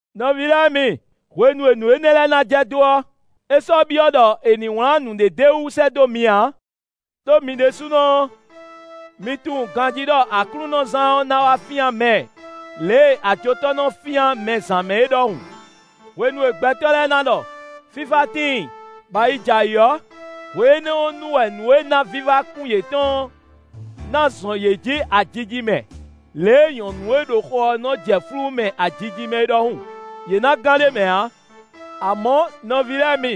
Nɔví lɛ́ɛ mi, hwenu e nǔ énɛ́ lɛ́ɛ ná jɛ dó ɔ́, é sɔ́ byɔ́ ɖɔ è nǐ wlán nǔɖé d'é wú sɛ́ dó mi ǎ. Đó mi ɖésúnɔ ɔ́, mi tunwun ganjí ɖɔ Aklúnɔzán ɔ́ ná wá fyán mɛ lě e ajotɔ́ nɔ wá fyán mɛ zǎn mɛ é ɖɔhun. Hwenu e gbɛtɔ́ lɛ́ɛ na ɖɔ: “Fífá tíin, bɔ ayi jɛ ayǐ” ɔ́, hwe énɛ́ ɔ́ nu wɛ nǔ e ná vívá kún yětɔn ɔ́ ná zɔn yě jǐ ajijimɛ lě e nyɔ̌nu e ɖo xo ɔ́ nɔ jɛ flú mɛ ajijimɛ é ɖɔhun; yě ná gán ɖ'é mɛ ǎ. Amɔ̌, nɔví lɛ́ɛ mi,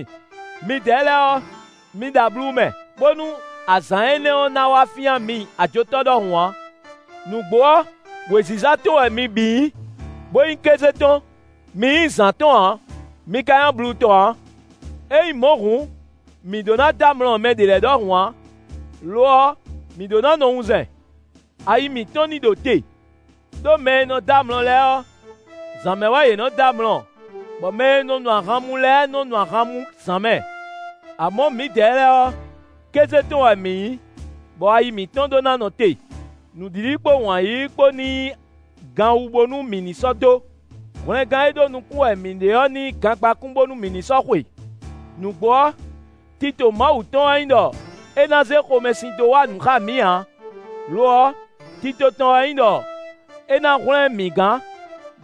midɛɛ lɛ́ɛ ɔ́, mi ɖo ablu mɛ, bónú azǎn énɛ́ ɔ́ ná wá fyán mi ajotɔ́ ɖɔhun ǎ. Nǔgbó ɔ́, wěziza tɔn wɛ mi bǐ nyí, bó nyí kéze tɔn; mi nyí zǎn tɔn ǎ; mi ka nyí ablu tɔn ǎ. Ényí mɔ̌ hǔn, mǐ ɖó ná dɔ́ amlɔ mɛ ɖě lɛ́ɛ ɖɔhun ǎ; lo ɔ́, mǐ ɖó ná nɔ wunzɛn; ayi mǐtɔn ní ɖo te. Đó mɛ e nɔ dɔ́ amlɔ lɛ́ɛ ɔ́, zǎn mɛ wɛ yě nɔ dɔ́ amlɔ, bɔ mɛ e nɔ nu ahan mú lɛ́ɛ nɔ́ nu ahan mú zǎn mɛ. Amɔ̌, mǐdɛɛ lɛ́ɛ ɔ́, kéze tɔn wɛ mǐ nyí, bɔ ayi mǐtɔn ɖó ná nɔ te. Nǔɖiɖi kpó wǎn yíyí kpó ní nyí ganwu, bónú mǐ ní sɔ́ dó; hwlɛngán e ɖó nukún wɛ mǐ ɖe ɔ́ ní nyí gangbákún bónú mǐ ní sɔ́ xwe. Nǔgbó ɔ́, tito Mawu tɔn wɛ nyí ɖɔ é ná zé xomɛsin tɔn dó wa nǔ xá mǐ ǎ; lo ɔ́, tito tɔn wɛ nyí ɖɔ é ná hwlɛ́n mǐ gán,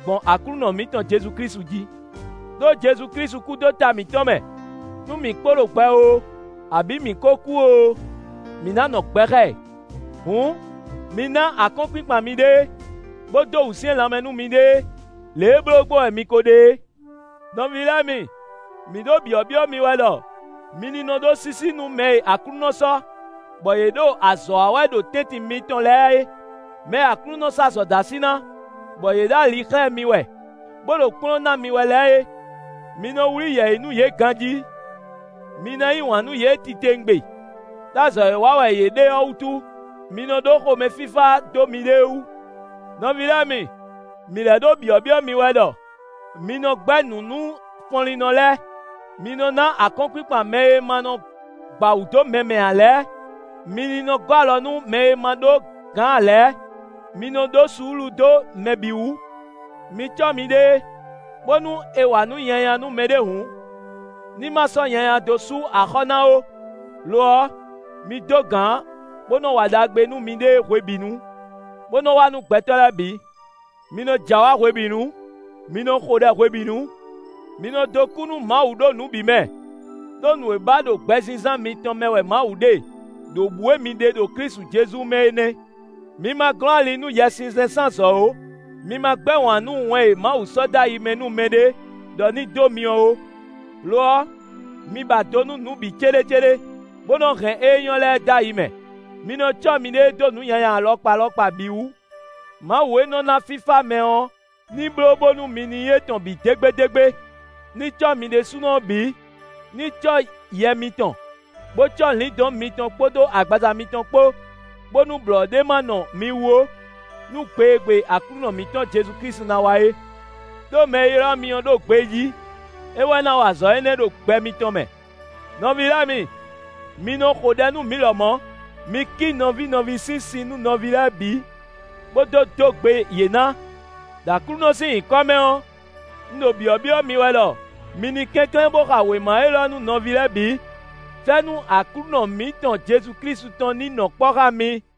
gbɔn Aklúnɔ mǐtɔn Jezu Klísu jí. Đó Jezu Klísu kú dó ta mǐtɔn mɛ, nú mǐ kpo ɖo gbɛ oo, abǐ mǐ kó kú oo, mǐ ná nɔ gbɛ xá ɛ. Hǔn, mi ná akɔ́nkpinkpan miɖée, bó dó wǔsyɛ́n lanmɛ nú miɖée, lě e bló gbɔn wɛ mi ko ɖe é. Nɔví lɛ́ɛ mi, mǐ ɖo byɔ̌byɔ́ mi wɛ ɖɔ mi nɔ ɖó sísí nú mɛ e Aklúnɔ sɔ́, bɔ yě ɖo azɔ̌ wa wɛ ɖo tɛ́ntin mitɔn lɛ́ɛ é; mɛ e Aklúnɔ sɔ́ azɔ̌ dó así ná, bɔ yě ɖo ali xlɛ́ mi wɛ, bó ɖo kplɔ́n ná mi wɛ lɛ́ɛ é. Mi nɔ wlí yɛ̌yi nú yě ganjí; mi ná yí wǎn nú yě titewungbe, ɖó azɔ̌ e wa wɛ yě ɖe ɔ́ wútu. Mi nɔ ɖó xomɛfífá dó miɖée wú. Nɔví lɛ́ɛ mi, mǐ lɛ́ ɖo byɔ̌byɔ́ mi wɛ ɖɔ mi nɔ gbɛ́ nǔ nú fɔnlínnɔ lɛ́ɛ; mi nɔ ná akɔ́nkpinkpan mɛ e ma nɔ gba wǔ dó mɛ mɛ ǎ lɛ́ɛ; mi ní nɔ gɔ́ alɔ nú mɛ e ma ɖó gǎn ǎ lɛ́ɛ; mi nɔ ɖó suúlu dó mɛ bǐ wú. Mi cɔ́ miɖée, bónú è wa nǔ nyanya nú mɛɖé hǔn, ní ma sɔ́ nyanya dó sú axɔ́ ná ó; lo ɔ́, mi dó gǎn bó nɔ wa ɖagbe nú miɖée hwebǐnu, bó nɔ wa nú gbɛtɔ́ lɛ́ɛ bǐ. Mi nɔ jɛ awǎ hwebǐnu. Mi nɔ xo ɖɛ hwebǐnu. Mi nɔ dó kú nú Mawu ɖo nǔ bǐ mɛ; ɖó nǔ e ba ɖo gbɛzínzán mitɔn mɛ wɛ Mawu ɖe, ɖo bǔ e mi ɖe ɖo Klísu Jezu mɛ é nɛ́. Mi ma glɔ́n ali nú Yɛsinsɛn sín azɔ̌ ó. Mi ma gbɛ́ wǎn nú wɛn e Mawu sɔ́ dó ayi mɛ nú mɛɖé ɖɔ ní dó mi ɔ́ ó. Lo ɔ́, mi ba do nú nǔ bǐ céɖécéɖé, bó nɔ hɛn ée nyɔ́ lɛ́ɛ dó ayi mɛ. Mi nɔ́ cɔ́ miɖée dó nǔ nyanya alɔkpa alɔkpa bǐ wú. Mawu e nɔ ná fífá mɛ ɔ́ ní bló bónú mi ní nyí étɔn bǐ dégbédégbé, ní cɔ́ mi ɖésúnɔ ɔ́ bǐ, ní cɔ́ yɛ mitɔn, bó cɔ́ lǐndɔ̌n mitɔn kpódó agbaza mitɔn kpó, bónú blɔ̌ ɖé ma nɔ mi wú ó, nú gbe e gbe Aklúnɔ mǐtɔn Jezu Klísu ná wá é. Đó mɛ e ylɔ́ mi ɔ́ ɖo gbejí; é wɛ ná wa azɔ̌ énɛ́ ɖo gbɛ mitɔn mɛ. Nɔví lɛ́ɛ mi, mi nɔ xo ɖɛ nú mǐ lɔmɔ̌. Mi kí nɔví nɔví sín si nú nɔví lɛ́ɛ bǐ, bó dó dó gbe yě ná. Đo Aklúnɔ sín nyǐkɔ mɛ ɔ́, un ɖo byɔ̌byɔ́ mi wɛ ɖɔ mi ní kɛnklɛ́n bó xa wěma élɔ́ nú nɔví lɛ́ɛ bǐ. Fɛ́nú Aklúnɔ mǐtɔn Jezu Klísu tɔn ní nɔ kpɔ́ xá mi.